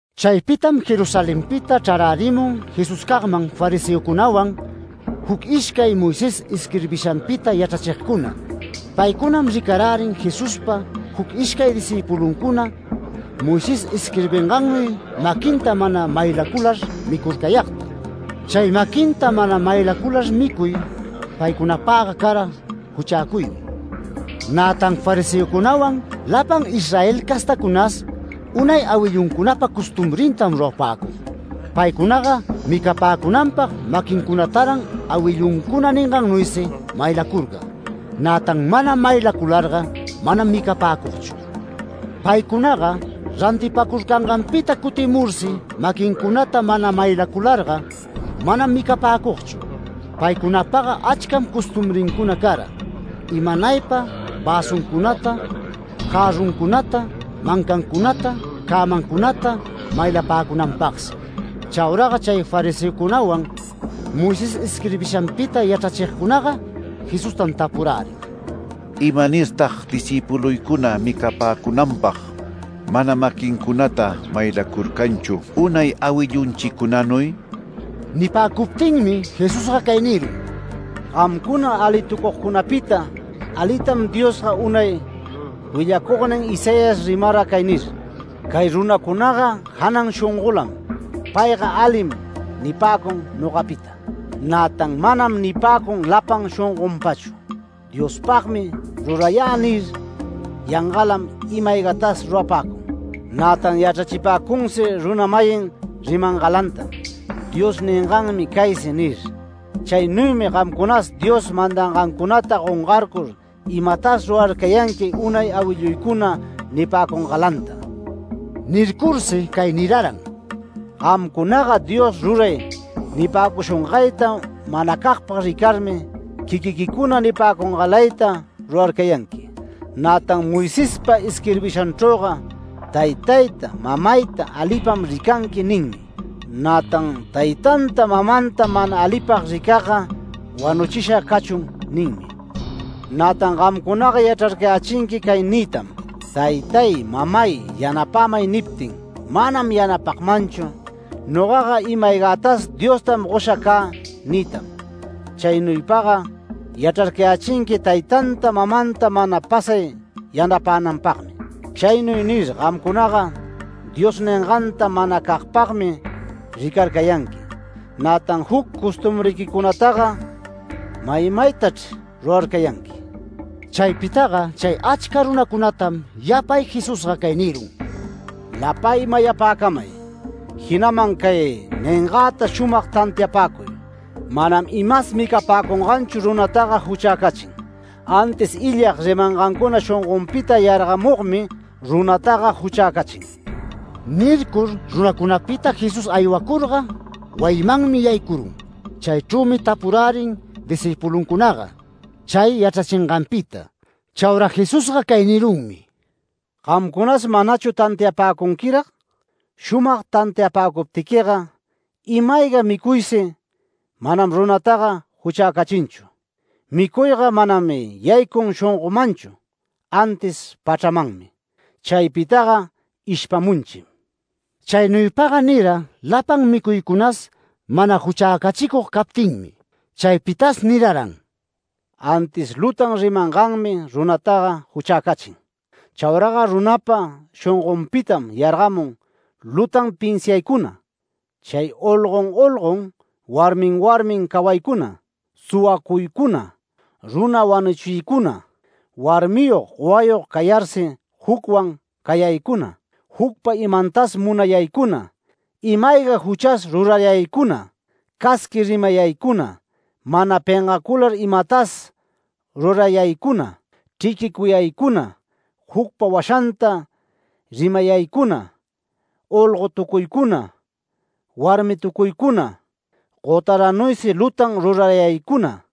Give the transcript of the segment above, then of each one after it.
Chaypitam Jerusalenpita chrarärimun Jesuscagman fariseocunawan, juc ishcay Moisés isquirbishanpita yachrachigcuna. Paycunam ricarärin Jesuspa juc ishcay discïpuluncuna Moisés isquirbingannuy maquinta mana maylacular micurcayagta. Chay maquinta mana maylacular micuy paycunapagga cara juchäcuymi. Nätan fariseocunawan lapan Israel castacunas unay awilluncunapa costumbrintam rurapäcug. Paycunaga micapäcunanpag maquincunataran awilluncuna ningannuysi maylacurcag, nätan mana maylacularga manam micapäcugchu. Paycunaga rantipäcurcanganpita cutimursi maquincunata mana maylacularga manam micapäcugchu. Paycunapaga achcam costumbrincuna cara, imanaypa väsuncunata, jarruncunata, mancancunata, cämancunata, maylapäcunanpagsi. Chauraga chay fariseocunawan, Moisés isquirbishanpita yachrachigcunaga Jesustam tapurärin: “¿Imanirtag discïpuluycuna micapäcunanpag mana maquincunata maylacurcanchu unay awillunchicunanuy?” Nipäcuptinmi Jesusga cay nirun: “Gamcuna alitucugcunapita, alitam Diospa unay willacugnin Isaías rimara cay nir: Cay runacunaga janan shongolam, ‘Payga alim’ nipäcun nogapita. Nätan ‘Manam’ nipäcun lapan shongonpachu. ‘Diospagmi rurayä’ nir, yangalam ima-aygatas rurapäcun. Nätan yachrachipäcunsi runa-mayin rimangalantam, ‘Dios ninganmi caysi’ nir. Chaynuymi gamcunas Dios mandangancunata gongayur, imatas rurarcayanqui unay awilluycuna nipäcungalanta”. Nircursi cay niraran: “Gamcunaga ‘Dios ruray’ nipäcushungayta manacagpag ricarmi, quiquiquicuna nipäcungalayta rurarcayanqui. Nätan Moisespa isquirbishanchrüga ‘Taytayta mamayta alipam ricanqui’ ninmi. Nätan ‘Taytanta mamanta mana alipag ricagga, wanuchisha cachun’ ninmi. Nätan gamcunaga yachrarcayächinqui cay niytam: ‘Taytay mamay, “Yanapämay” niptin, manam yanapagmanchu. Nogaga ima-aygätas Diostam gosha cä’ niytam. Chaynuypaga yachrarcayächinqui taytanta mamanta mana pasay yanapänanpagmi. Chaynuy nir, gamcunaga Dios ninganta manacagpagmi ricarcayanqui, nätan juc costumbriquicunataga maymaytachr rurarcayanqui”. Chaypitaga chay achca runacunatam yapay Jesusga cay nirun: “Lapay mayapäcamay, jinaman cay ningäta shumag tantiapäcuy. Manam imas micapäcunganchu runataga juchäcachin, antis illag rimangancuna shongonpita yargamugmi runataga juchäcachin”. Nircur runacunapita Jesús aywacurga wayimanmi yaycurun, chaychrümi tapurärin discïpuluncunaga chay yachrachinganpita. Chaura Jesusga cay nirunmi: “¿Gamcunas manachu tantiapäcunquirag? Shumag tantiapäcuptiquiga, ‘Ima-ayga micuysi manam runataga juchäcachinchu’. Micuyga manam yaycun shongomanchu antis pachramanmi, chaypitaga ishpamunchim”. Chaynuypaga nira lapan micuycunas mana juchäcachicug captinmi. Chaypitas niraran: “Antis lutan rimanganmi runataga juchäcachin. Chauraga runapa shongonpitam yargamun, lutan pinsiaycuna, chay olgon olgon, warmin warmin cawaycuna, suwacuycuna, runa wanuchiycuna, warmiyog gowayog cayarsi jucwan cayaycuna, jucpa imantas munayaycuna, ima-ayga juchas rurayaycuna, casqui rimayaycuna, mana pengacular imatas rurayaycuna, chriquicuyaycuna, jucpa washanta rimayaycuna, olgotucuycuna, warmitucuycuna, gotaranuysi lutan rurayaycuna.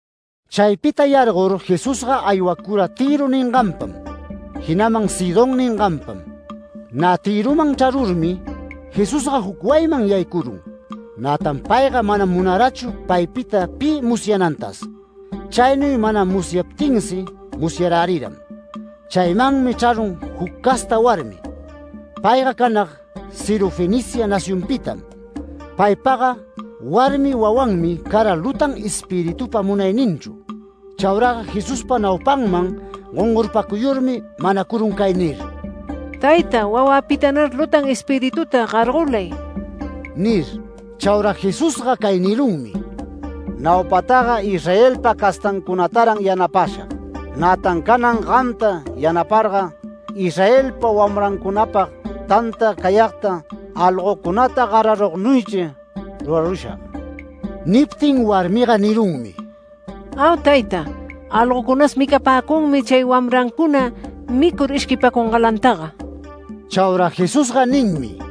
Chaypita yargor Jesusga aywacura Tïro ninganpam, jinaman Sidón ninganpam. Nä Tïroman chrarurmi, Jesusga juc wayiman yaycurun. Nätan payga manam munarachu paypita pi musyanantas. Chaynuy mana munayaptinsi musyaräriram. Chaymanmi chrarun juc casta warmi. Payga canag Sirofenicia nacionpitam. Paypaga warmi wawanmi cara lutan espiritupa munayninchru. Chauraga Jesuspa naupanman gongorpacuyurmi manacurun cay nir: “Tayta, wawäpitanar lutan espirituta gargolay” nir. Chaura Jesusga cay nirunmi: “Naupataga Israelpa castancunataran yanapashag. Nätan canan gamta yanaparga, Israelpa wamrancunapag tanta cayagta algocunata gararugnuychri rurarushag”. Niptin warmiga nirunmi: “Au tayta. Algocunas micapäcunmi chay wamrancuna micur ishquipäcungalantaga”. Chaura Jesusga ninmi: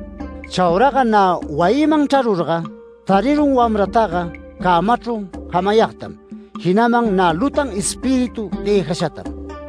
Chauraga nä wayinman chrarurga tarirun wamrantaga cämachru jamayagtam. Jinaman nä lutan espíritu dëjashatam.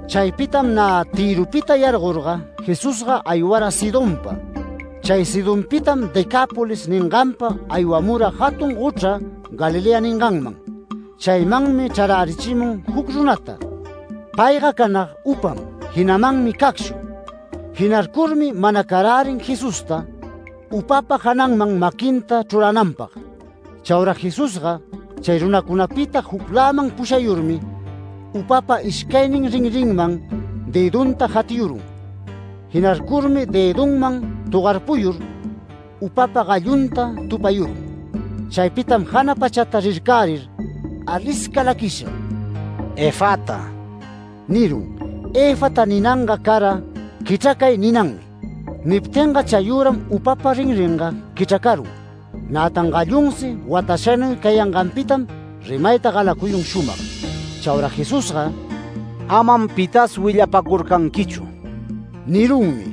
Chaypitam nä Tïropita yargorga, Jesusga aywara Sidonpa, chay Sidonpitam Decápolis ninganpa aywamura jatun gochra Galilea ninganman. Chaymanmi chrarärichimun juc runata. Payga canag upam, jinamanmi cacshu, jinarcurmi manacarärin Jesusta upapa jananman maquinta chrurananpag. Chaura Jesusga chay runacunapita jucläman pushayurmi, upapa ishcaynin rinrinman dëdunta jatiyurun. Jinarcurmi dëdunman togarpuyur upapa gallunta tupayurun. Chaypitam jana pachata rircärir alisca laquisha “Efata” nirun. ‘Efata’ ninanga cara ‘Quichracay’ ninanmi. Niptinga chayüram upapa rinringa quichracarun, nätan gallunsi watashanuy cayanganpitam rimayta galacuyun shumag. Chaura Jesusga “Amam pitas willapäcurcanquichu” nirunmi.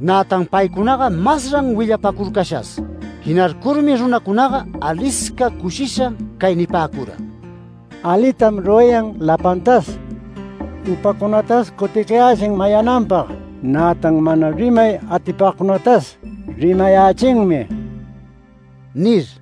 Nätan paycunaga masran willapacurcashas. Jinarcurmi runacunaga alisca cushisha cay nipäcura: “Alitam rurayan lapantas. Upacunatas cuticayächin mayananpag, nätan mana rimay atipagcunatas rimayächinmi” nir.